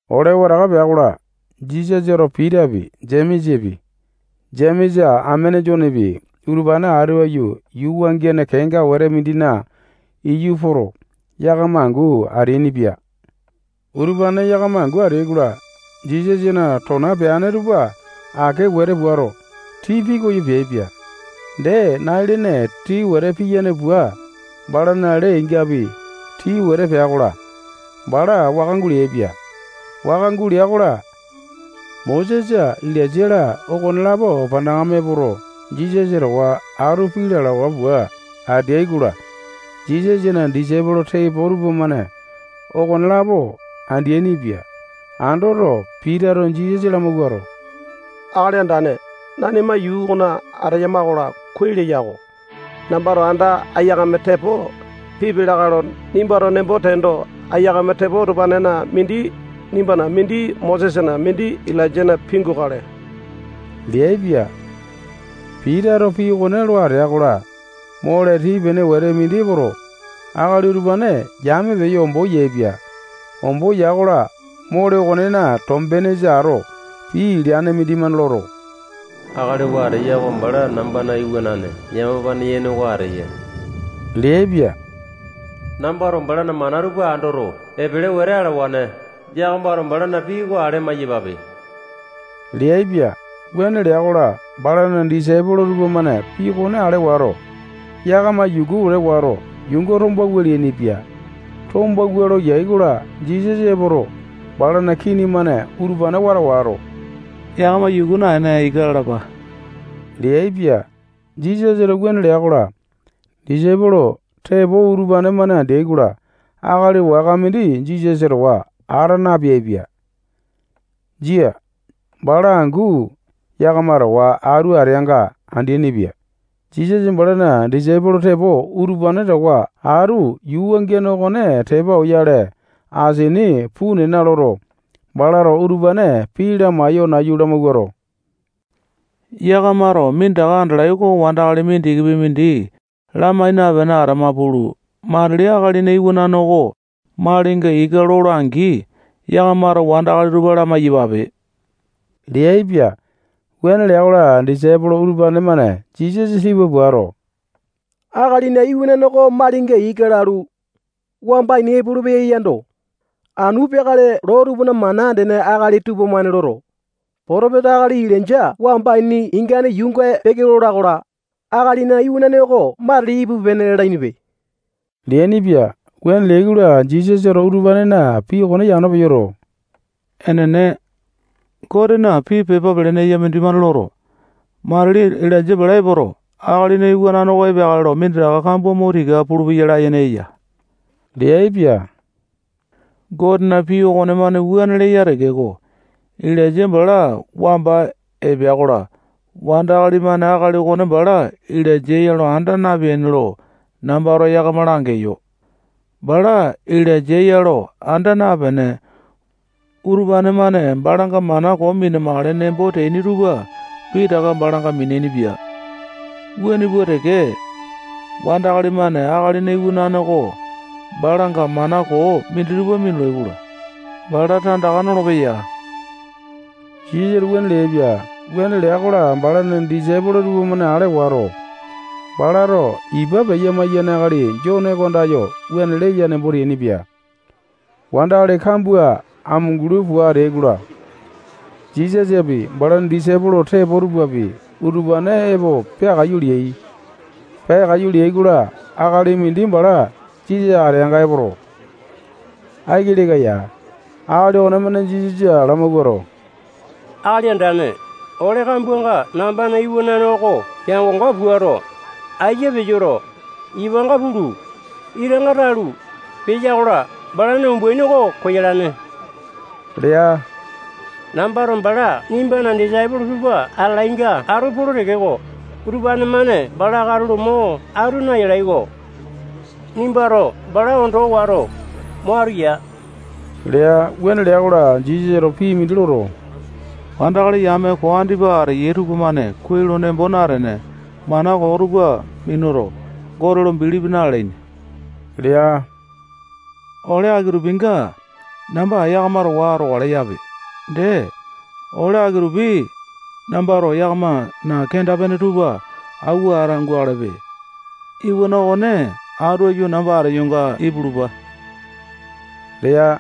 Ole wataka pea-kola, Jisasato Pitapi, Jemesapi, Jemesa amene Jonepi, utupane atu aiyu yuu wangiane kenga wete mindina iyu poto, yakama angu ateainipia. Utupane yakama angu ateai-kola, Jisasana tona peane tupa ake wete puato, tii pikoyo peaipia. Dee, nai-lene tii wete piyane pua, balana lee-ingapi tii wete pea-kola, bala waka guleaipia. Waka gulea-kola, Mosesa Ilainja-la, okonelapo panakame epoto, Jisasa towa atu pii lalawa pua ateai-kola, Jisasana disaipolo tepo tupamane okonelapo andeaini-pia. Andoto, Pitato Jisasa lamawuato, Akali Andane, nanima yuu okona ateyama-kola, kuai leya-ko. Nambato anda aiyakame tepo pipia lakae lo nimbato nembo teendo, aiyakame tepo utupanena mindi nimbana, mindi Mosesana, mindi Ilainjana pingukale leaipia. Pitato pii okone lo atea-kola, mole tii-pene wete mindi epoto, akali utupane yame peyo, ombo yaepia. Ombo ya-kola, mole okonena tombenesa ato pii leane mindimane loto, akali oo ateya oko bala nambana iwanane yamapane yene oko ateya leaipia. Nambato balana mana tupa andoto, epele wete alawane. Yakamato balana pii oko ale amai-yapape leaipia. Wuane lea-kola, balana disaipolo tupamane pii okone ale wato, yakama yuku wete wato, yuunga tombawua leainipia. Tombawua lo yai-kola, Jisasa epoto, balana kini-mane utupane wata wato, yakama yuku naene, ika lalapa leaipia. Jisasato wuane lea-kola, disaipolo tepo utupane-mane andeai-kola, akali waka mindi Jisasa towa ata napeaipia. Jia. Bala angu yakama towa atu ateanga andeaini-pia. Jisasa balana disaipolo tepo utupane towa atu yuu wangiane okone tepa oyale, asini puu nena loto, balato utupane pii lamaiyo nayu lamawuato, yakamato minditaka andalai oko wandakali mindikipi mindi lamai napene atama pulu, matili Akalina Iwanane oko malinga ika lola-angi, yakamato wandakali tupa lamai-yapape leaipia. Wuane lea-kola, disaipolo utupane-mane Jisasa tipa puato, Akalina Iwanane oko malinga ika lalu, wamba ini epolopeya yando, anu peakale loo tupana mana andene akali tupamane loto, potopesa akali Ilainja wamba ini ingane yuunga peke lola-kola, Akalina Iwanane oko matili ipupe-pene lalainipe leainipia. Wuane leai-kola, Jisasato utupanena pii okone yano peyoto, enene, Gotena pii pepa pelene eya mindimane loto, matili Ilainja bala epoto, Akalina Iwanane oko epeakale lo minditaka kambua mo tika pulupeya layene eya leaipia. Gotena pii okonemane wuane leya tekeko, Ilainja bala wamba epea-kola, wandakali-mane akali okone bala Ilainja ya lo anda napeaini lo nambato yakama langeyo. Bala Ilainja ya lo anda napene, utupane-mane balanga mana koo mina-makale nembo teaini tupa pitaka balanga miniaini-pia. Wuane pua teke, wandakali-mane Akalina Iwanane oko balanga mana koo minditupa minulai-kola, bala tandaka nolopeya. Jisasato wuane leaipia. Wuane lea-kola, balana disaipolo tupamane ale wato, balato ipa peya-maiyane akali Jone oko andayo wuane leya nembo teainipia. Wandakali kambua amunguli pua ateai-kola, Jisasapi, balana disaipolo tepo tupapi, utupane epo peakaiyu leai. Peakaiyu leai-kola, akali mindi bala Jisasa ateanga epoto, aiki leka ya. Akali okonemane Jisasa lamawuato, Akali Andane, ole kambuanga nambana iwanane oko peango-ngo puato, aiya peyoto, ipanga pulu, itanga talu, peya-kola, balana umbaini oko koyalane lea. Nambato bala nimbana disaipolo tupa atalainga atu polo tekeko, utupane-mane bala katulo mo atu nayalai-ko. Nimbato bala ondo wato, mo atu yaa lea. Wuane lea-kola, Jisasato pii mindi loto, wandakali yame koo andipa ateyai tupamane kuai lo nembo natene, mana koo tupa minuto, Gote lo bilipi na-lalaini lea. Ole aki-tupinga namba yakama towa atokale yape. Dee, ole aki-tupi nambato yakamana kenda-pene tupa awua ata gukalepe. Iwana okone atu aiyu namba ateyonga ipulupa lea.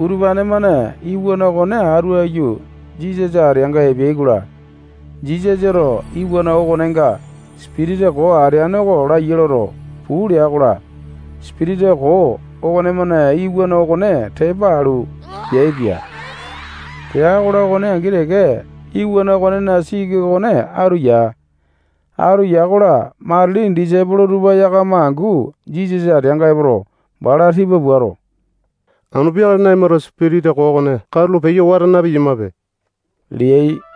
Utupane-mane iwana okone atu aiyu Jisasa ateanga epeai-kola, Jisasato iwana okonenga sipitisa koo ateane oko laiya loto, puu lea-kola, sipitisa koo okonemane iwana okone tepa alu, peaipia. Pea-kola, okone angi teke iwana okonena siki okone atu ya. Atu ya-kola, matili disaipolo tupa yakama angu Jisasa ateanga epoto, bala tipa puato, anu peakale nanimato sipitisa koo okone katulo peyo wata na-piyamape leai.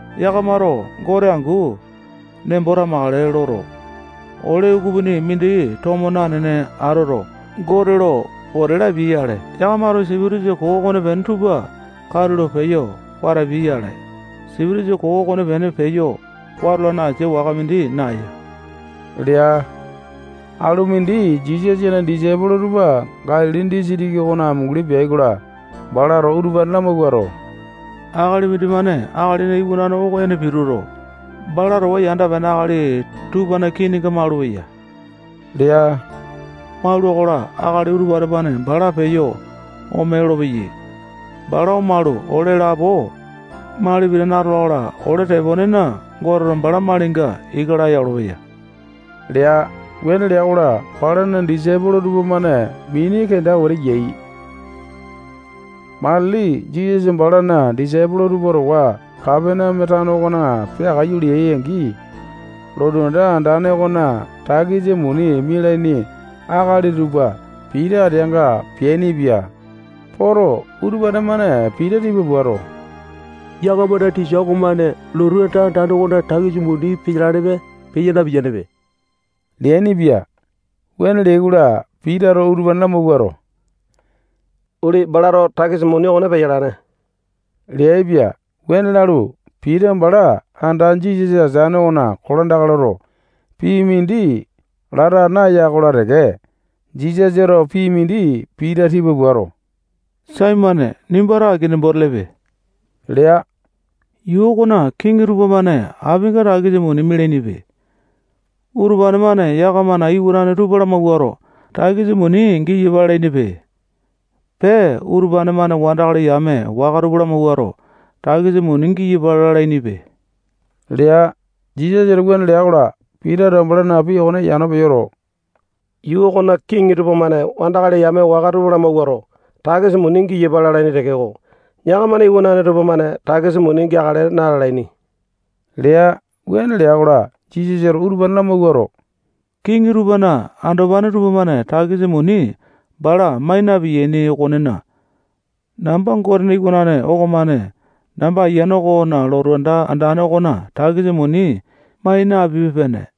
[Yakamato Gote angu nembo tamakale loto, ole ukupini mindi tomo nanene atoto, Gote lo pote lapiai-yale, yakamato sipitisa koo okonepene tupa katulo peyo watapiai-yale. Sipitisa koo okonepene peyo watolane asia waka mindi naeya lea.] Alu mindi Jisasana disaipolo tupa Galili disitiki okona amunguli peai-kola, balato utupane lamawuato, akali mindimane Akalina Iwanane oko ene pituto, bala towa yanda-pene akali tupana kininga maulupeya lea. Maula-kola, akali utupane-mane bala peyo ome lolopeyai. Bala omalu, ole lapo mali pitane atola-kola, ole teponena, Goteto bala malinga ika laya olopeya lea. Wuane lea-kola, balana disaipolo tupamane mini kenda wete yai. Matili Jisasa balana disaipolo tupa towa Kapaneame tano okona peakaiyu leai-angi, lotu anda andane okona takisa muni mialaini akali tupa Pita ateanga peainipia. Poto, utupane-mane Pita tipa puato, yakamana tisa okomane lotu anda andane okona takisa muni peyalanepe, peya na-piyanepe leainipia. Wuane leai-kola, Pitato utupane lamawuato, uli, balato takisa muni okone peyalane leaipia. Wuane lalu, Pita bala anda Jisasa ateane okona kolandaka loto, pii mindi lata naya-kola teke, Jisasato pii mindi Pita tipa puato, Saimone, nimbato aki nembo telepe lea. Yuu okona kiŋi tupamane apinga takisa muni mialainipe. Utupane-mane yakamana iwanane tupa lamawuato, takisa muni giyapa lalainipe. Pee, utupane-mane wandakali yame waka tupa lamawuato, takisa muni giyapa lalainipe lea. Jisasato wuane lea-kola, Pitato balana pii okone yano peyoto, yuu okona kiŋi tupamane wandakali yame waka tupa lamawuato, takisa muni giyapa lalaini tekeko, yakamana iwanane tupamane takisa muni geakale na-lalaini lea. Wuane lea-kola, Jisasato utupane lamawuato, kiŋi tupana andopane tupamane takisa muni bala mai na-piyaini okonena, namba Gotena iwanane okomane namba ayiane okona lotu anda andane okona takisa muni mai napipe-pene.